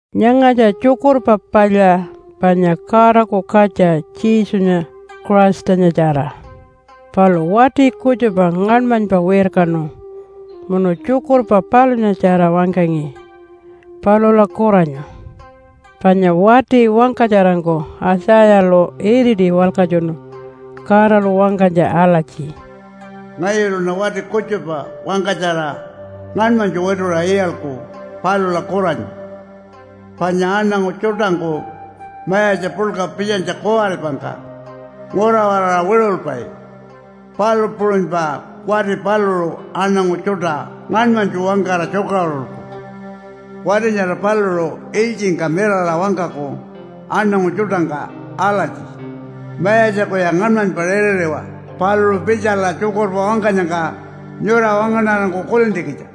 Nyangatja Tjukurpa Palya panya Godaku Katja Jesunya Christanyatjara. Palu wati kutjupa ngaṉmanypa wirkanu munu tjukurpa palunyatjara wangkangi palula kuranyu. Panya wati wangkatjarangku Aitjayalu iriti walkatjunu Godalu wangkanytja alatji, “Ngayuluṉa wati kutjupa wangkatjara ngaṉmanytju wituṟa iyalku palula kuranyu. Panya aṉangu tjuṯangku mayatja puḻka pitjanytja kuwaripangka ngura-waraṟa wiṟulpai, palu puṟunypa wati paluṟu aṉangu tjuṯa ngaṉmanytju wangkara tjukaṟurulku. Wati nyara paluṟu ilytjingka mirara wangkaku aṉangu tjuṯangka alatji, ‘Mayatjakuya ngaṉmanypa ritiriwa paluṟu pitjala tjukurpa wangkanyangka nyura wangaṉarangku kulintjikitja.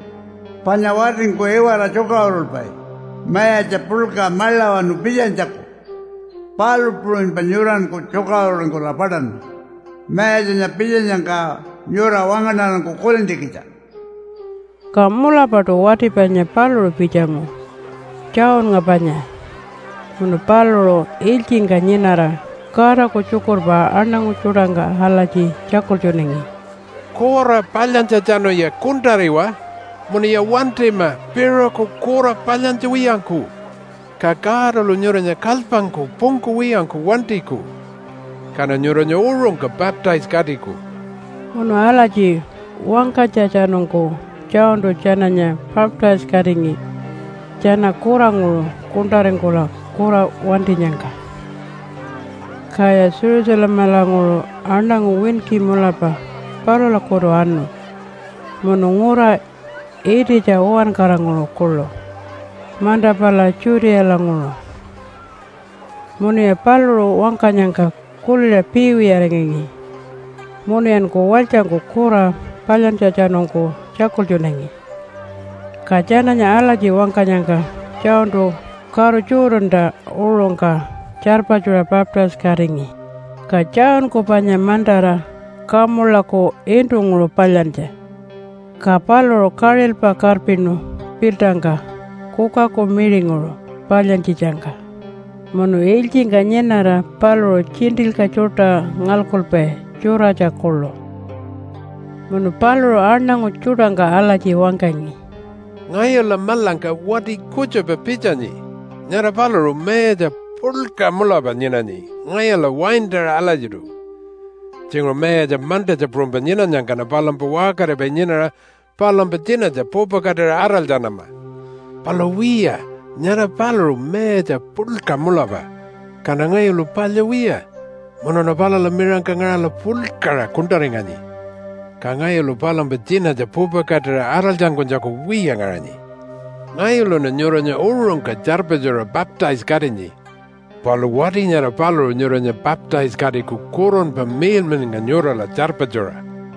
Panya watingku iwara tjukaṟurulpai mayatja puḻka maḻawanu pitjanytjaku, palu puṟunypa nyuranku tjukaṟururingkula paṯanma Mayatjanya pitjanyangka nyura wangaṉarangku kulintjikitja.’” Ka mulapaṯu wati panya paluṟu pitjangu, Johnnga panya, munu paluṟu ilytjingka nyinara Godaku tjukurpa aṉangu tjuṯangka alatji tjakultjunangi, “Kura palyantjatjanuya kuṉṯariwa munuya wantima piṟuku kura palyantja wiyangku, ka Godalu nyuranya kalypangku pungkuwiyangku wantiku, kaṉa nyuranya uṟungka baptise-katiku.” Munu alatji wangkanytjatjanungku Johntu tjananya baptise-katingi tjana kuranguṟu kuṉṯaringkula kura wantinyangka. Kaya Jerusalemalanguṟu aṉangu winki mulapa palulakutu anu munu ngura ititja uwankaranguṟu kuḻu manta pala Judealanguṟu. Munuya paluṟu wangkanyangka kuliṟa piiwiyaringangi munuyanku walytjangku kura palyantjatjanungku tjakultjunangi. Ka tjananya alatji wangkanyangka Johntu karu Jordanta uṟungka tjarpatjuṟa baptise-katingi. Ka Johnku panya mantara kamulaku iṉṯunguṟu palyantja, ka paluṟu kaṟilpa karpinu piltangka kukaku miṟinguṟu palyantjitjangka. Munu ilytjingka nyinara paluṟu tjiṉṯilyka tjuṯa ngalkupai tjuratja kuḻu. Munu paluṟu aṉangu tjuṯangka alatji wangkangi, “Ngayula maḻangka wati kutjupa pitjanyi. Nyara paluṟu mayatja puḻka mulapa nyinanyi ngayula waintaṟa alatjiṯu. Tjinguṟu mayatja mantatja puṟunypa nyinanyangkaṉa palumpa waṟkaripai nyinara palumpa tjinatja pupakatira araltjanama. Palu wiya, nyara paluṟu mayatja puḻka mulapa, kaṉa ngayulu palya wiya munuṉa palula miṟangka ngaṟala puḻkaṟa kuṉṯaringanyi. Ka ngayulu palumpa tjinatja pupakatira araltjankunytjaku wiya ngaṟanyi. Ngayuluṉa nyuranya uṟungka tjarpatjuṟa baptise-katinyi, palu wati nyara paluṟu nyuranya baptise-katiku Kurunpa Miḻmiḻnga nyurala tjarpatjuṟa.”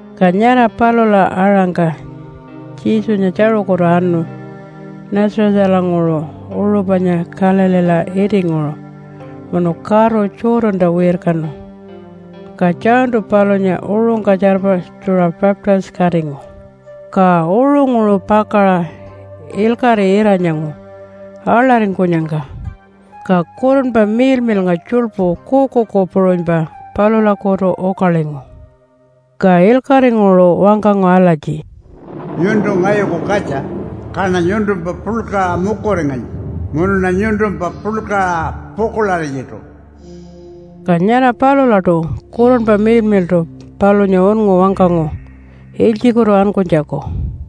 Ka nyara palula aṟangka Jesunya tjaṟukutu anu Nazarethalanguṟu uṟu panya Galileela itinguṟu, munu karu Jordanta wirkanu, ka Johntu palunya uṟungka tjarpatjuṟa baptise-katingu. Ka uṟunguṟu pakaṟa ilkaṟi ira-nyangu aḻaringkunyangka, ka Kurunpa Miḻmiḻnga tjuḻpu kuukuuku puṟunypa palulakutu ukalingu. Ka ilkaṟinguṟu wangkangu alatji, “Nyuntu ngayuku katja, kaṉa nyuntumpa puḻkaṟa mukuringanyi munuṉa nyuntumpa puḻkaṟa pukuḻarinyiṯu.” Ka nyara palulaṯu Kurunpa Miḻmiḻṯu palunya unngu wangkangu ilytjikutu ankunytjaku.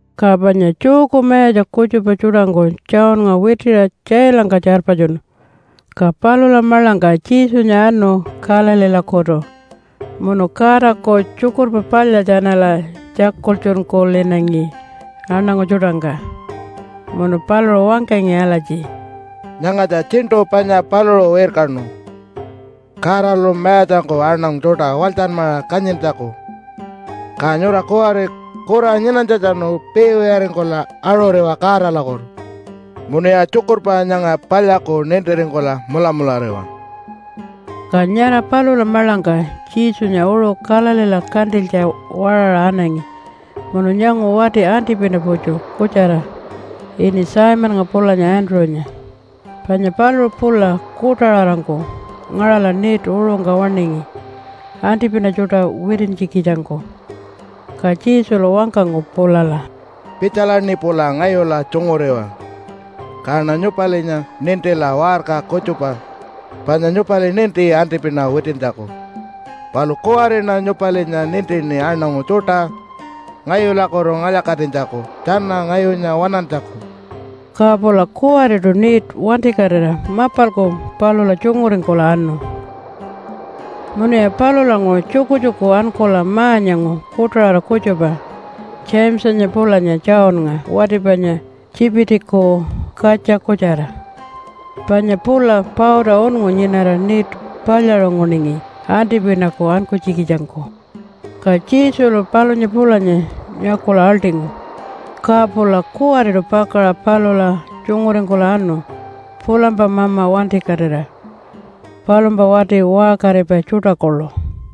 Ka panya Jewku mayatja kutjupa tjuṯangku Johnnga witiṟa tjailangka tjarpatjunu. Ka palula maḻangka Jesunya anu Galileelakutu munu Godaku Tjukurpa Palya tjanala tjakultjunkulinangi aṉangu tjuṯangka. Munu paluṟu wangkangi alatji, “Nyangatja tjiṉṯu panya paluṟu wirkanu Godalu mayatjangku aṉangu tjuṯa walytjanmaṟa kanyintjaku. Ka nyura kuwari kura nyinanytjatjanu piiwiyaringkula aṟuriwa Godalakutu munuya tjukurpa nyanga palyaku nintiringkula mulamulariwa.” Ka nyara palula maḻangka Jesunya uṟu Galileela kantilytja waṟaṟa anangi munu nyangu wati antipina-putju kutjara ini Simonnga pulanya Andrew-nya. Panya paluṟu pula kuṯaṟarangku ngaṟala net uṟungka waṉingi antipina tjuṯa witintjikitjangku. Ka Jesulu wangkangu pulala, “Pitjalaṉi pula ngayula tjunguriwa, kaṉa nyupalinya nintila waṟka kutjupa. Panya nyupali ninti antipina witintjaku, palu kuwariṉa nyupalinya nintini aṉangu tjuṯa ngayulakutu ngalya-katinytjaku tjana ngayunya waṉantjaku.” Ka pula kuwariṯu net wantikatira mapalku palula tjunguringkula anu. Munuya palulanguṟu tjukutjuku ankula ma-nyangu kuṯaṟara kutjupa Jamesanya pulanya Johnnga wati panya Tjipitiku katja kutjara. Panya pula pauta unngu nyinara net palyaṟunguningi antipinaku ankunytjikitjangku. Ka Jesulu palunya pulanya nyakula aḻṯingu. Ka pula kuwariṯu pakaṟa palula tjunguringkula anu pulampa mama wantikatira palumpa wati waṟkaripai tjuṯa kuḻu.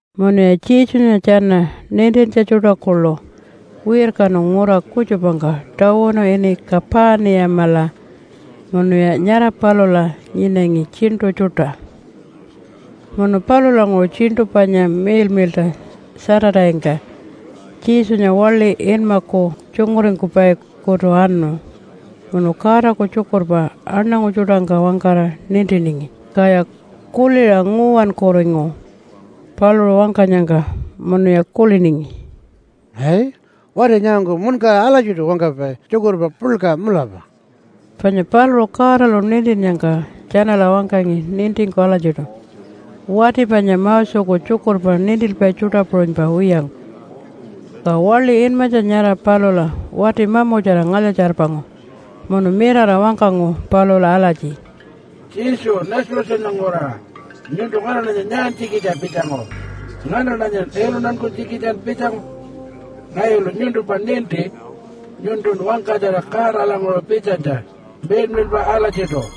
Munuya Jesunya tjana nintintja tjuṯa kuḻu wirkanu ngura kutjupangka tawunu ini Kapaniyamala munuya nyara palula nyinangi tjiṉṯu tjuṯa. Munu palulanguṟu tjiṉṯu panya miḻmiḻṯa Saturday-ngka Jesunya waḻi inmaku tjunguringkupai-kutu anu munu Godaku tjukurpa aṉangu tjuṯangka wangkara nintiningi. Kaya kuliṟa nguwankuringu paluṟu wangkanyangka, munuya kuliningi, “Ai, wati nyangangku muṉkara alatjiṯu wangkapai tjukurpa puḻka mulapa.” Panya paluṟu Godalu nintinnyangka tjanala wangkangi nintingku alatjiṯu, wati panya Moseku tjukurpa nintilpai tjuṯa puṟunypa wiyangku. Ka waḻi inmatja nyara palula wati mamutjara ngalya-tjarpangu munu mirara wangkangu palula alatji, “Jesu Nazarethanya nguraṟa, nyuntu nganaṉanya nyaantjikitja pitjangu? Nganaṉanya iluntankunytjikitjan pitjangu? Ngayulu nyuntumpa ninti. Nyuntun wangkatjara Godalanguṟu pitjanytja miḻmiḻpa alatjiṯu.”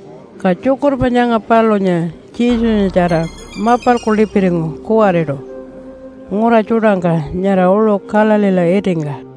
Ka tjukurpa nyanga palunya Jesunyatjara mapalku lipiringu kuwariṯu ngura tjuṯangka nyara uṟu Galileela itingka.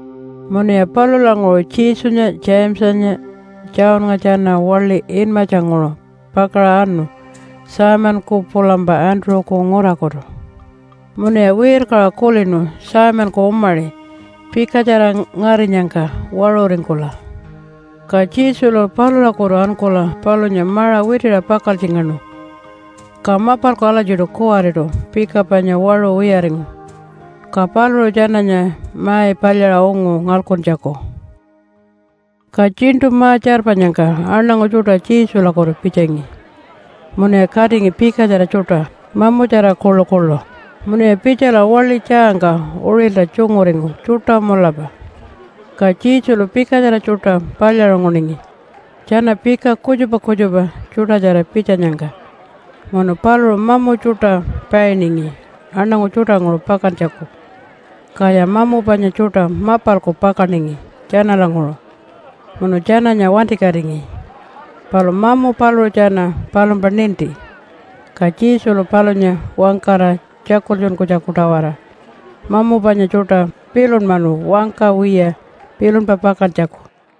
Munuya palulanguṟu Jesunya, Jamesanya Johnnga tjana waḻi inmatjanguṟu pakaṟa anu Simonku pulampa Andrew-ku ngurakutu. Munuya wirkaṟa kulinu Simonku umaṟi pikatjara ngarinyangka waṟuringkula. Ka Jesulu palulakutu ankula palunya maṟa witiṟa pakaltjingaṉu. Ka mapalku alatjiṯu kuwariṯu pika panya waṟu wiyaringu. Ka paluṟu tjananya mai palyaṟa ungu ngalkuntjaku. Ka tjiṉṯu ma-tjarpanyangka aṉangu tjuṯa Jesulakutu pitjangi munuya katingi pikatjara tjuṯa, mamutjara kuḻukuḻu. Munuya pitjala waḻi tjaangka uṟilta tjunguringu tjuṯa mulapa. Ka Jesulu pikatjara tjuṯa palyaṟunguningi tjana pika kutjupa kutjupa tjuṯatjara pitjanyangka, munu paluṟu mamu tjuṯa painingi aṉangu tjuṯanguṟu pakantjaku. Kaya mamu panya tjuṯa mapalku pakaningi tjanalanguṟu munu tjananya wantikatingi. Palu mamu paluṟu tjana palumpa ninti, ka Jesulu palunya wangkara tjakultjunkunytjaku-tawara mamu panya tjuṯa pilunmanu wangka wiya pilunpa pakantjaku.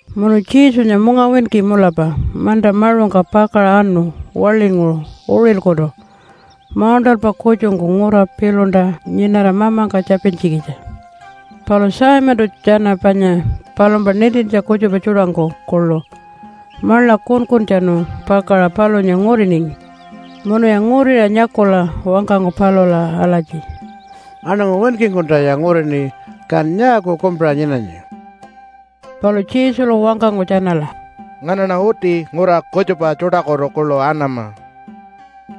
Munu Jesunya mungawinki mulapa manta maṟungka pakaṟa anu waḻinguṟu uṟilkutu mauṉṯalpa kutjungku ngura piḻunta nyinara Mamangka tjapintjikitja. Palu Simontu tjana panya palumpa nintintja kutjupa tjuṯangku kuḻu maḻa kunkuntjanu pakaṟa palunya nguriningi. Munuya nguriṟa nyakula wangkangu palula alatji, “Aṉangu winkingkuntaya ngurini. Kan nyaaku kumpiṟa nyinanyi?” Palu Jesulu wangkangu tjanala, “Nganaṉa uti ngura kutjupa tjuṯakutu kuḻu anama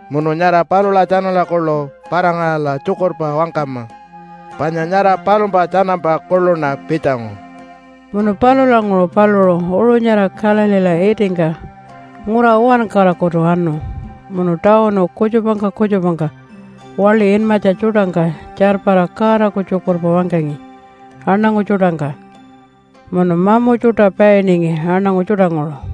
munu nyara palula tjanala kuḻu para-ngaṟala tjukurpa wangkama, panya nyara palumpa tjanampa kuḻuṉa pitjangu.” Munu palulanguṟu paluṟu uṟu nyara Galileela itingka ngura uwankarakutu anu munu tawunu kutjupangka kutjupangka waḻi inmatja tjuṯangka tjarpara Godaku tjukurpa wangkangi aṉangu tjuṯangka, munu mamu tjuṯa painingi aṉangu tjuṯanguṟu.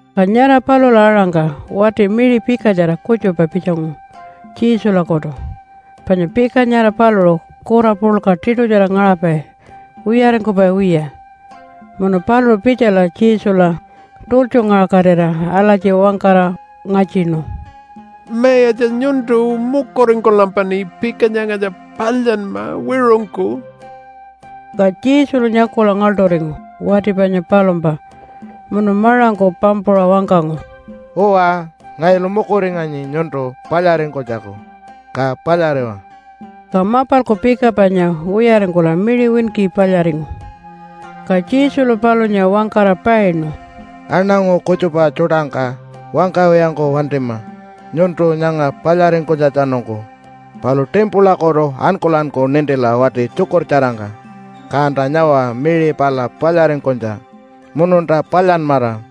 Ka nyara palula aṟangka wati miṟi pikatjara kutjupa pitjangu Jesulakutu, panya pika nyara paluṟu kura puḻka tiṯutjara ngaṟapai wiyaringkupai wiya. Munu paluṟu pitjala Jesula tultjungaṟakatira alatji wangkara ngatjinu, “Mayatja nyuntu mukuringkulampaṉi pika nyangatja palyanma wiṟungku.” Ka Jesulu nyakula ngaḻṯuringu wati panya palumpa munu maṟangku pampuṟa wangkangu, “Uwa, ngayulu mukuringanyi nyuntu palyaringkunytjaku, ka palyariwa.” Ka mapalku pika panya wiyaringkula miṟi winki palyaringu. Ka Jesulu palunya wangkara painu, “Aṉangu kutjupa tjuṯangka wangkawiyangku wantima nyuntu nyanga palyaringkunytjatjanungku. Palu timpulakutu ankulanku nintila wati tjukurtjarangka, kanta nyawa miṟi pala palyaringkunytja mununta palyanmara.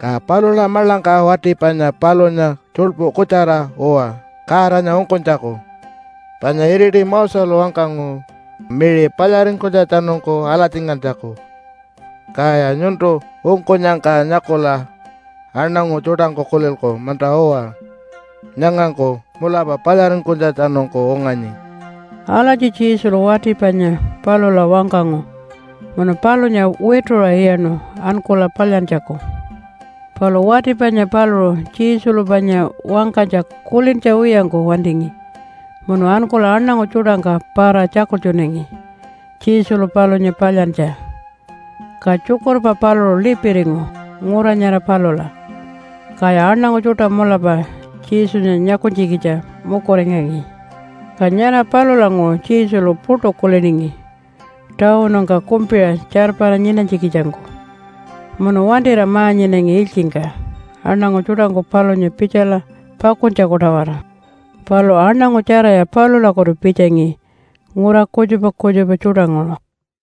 Ka palula maḻangka wati panya palunya tjuḻpu kutjara uwa Godanya ungkunytjaku, panya iriti Moselu wangkangu miṟi palyaringkunytjatjanungku alatjingantjaku. Kaya nyuntu ungkunyangka nyakula aṉangu tjuṯangku kulilku, ‘Munta-uwa, nyangangku mulapa palyaringkunytjatjanungku unganyi.’” Alatji Jesulu wati panya palula wangkangu munu palunya wituṟa iyaṉu ankula palyantjaku. Palu wati panya paluṟu Jesulu panya wangkanytja kulintja wiyangku wantingi munu ankula aṉangu tjuṯangka para-tjakultjunangi Jesulu palunya palyantja. Ka tjukurpa paluṟu lipiringu ngura nyara palula, kaya aṉangu tjuṯa mulapa Jesunya nyakunytjikitja mukuringangi. Ka nyara palulanguṟu Jesulu puṯu kuliningi tawunungka kumpiṟa tjarpara nyinanytjikitjangku munu wantira ma-nyinangi ilytjingka aṉangu tjuṯangku palunya pitjala pakuntjaku-tawara. Palu aṉangu tjaraya palulakutu pitjangi ngura kutjupa kutjupa tjuṯanguṟu.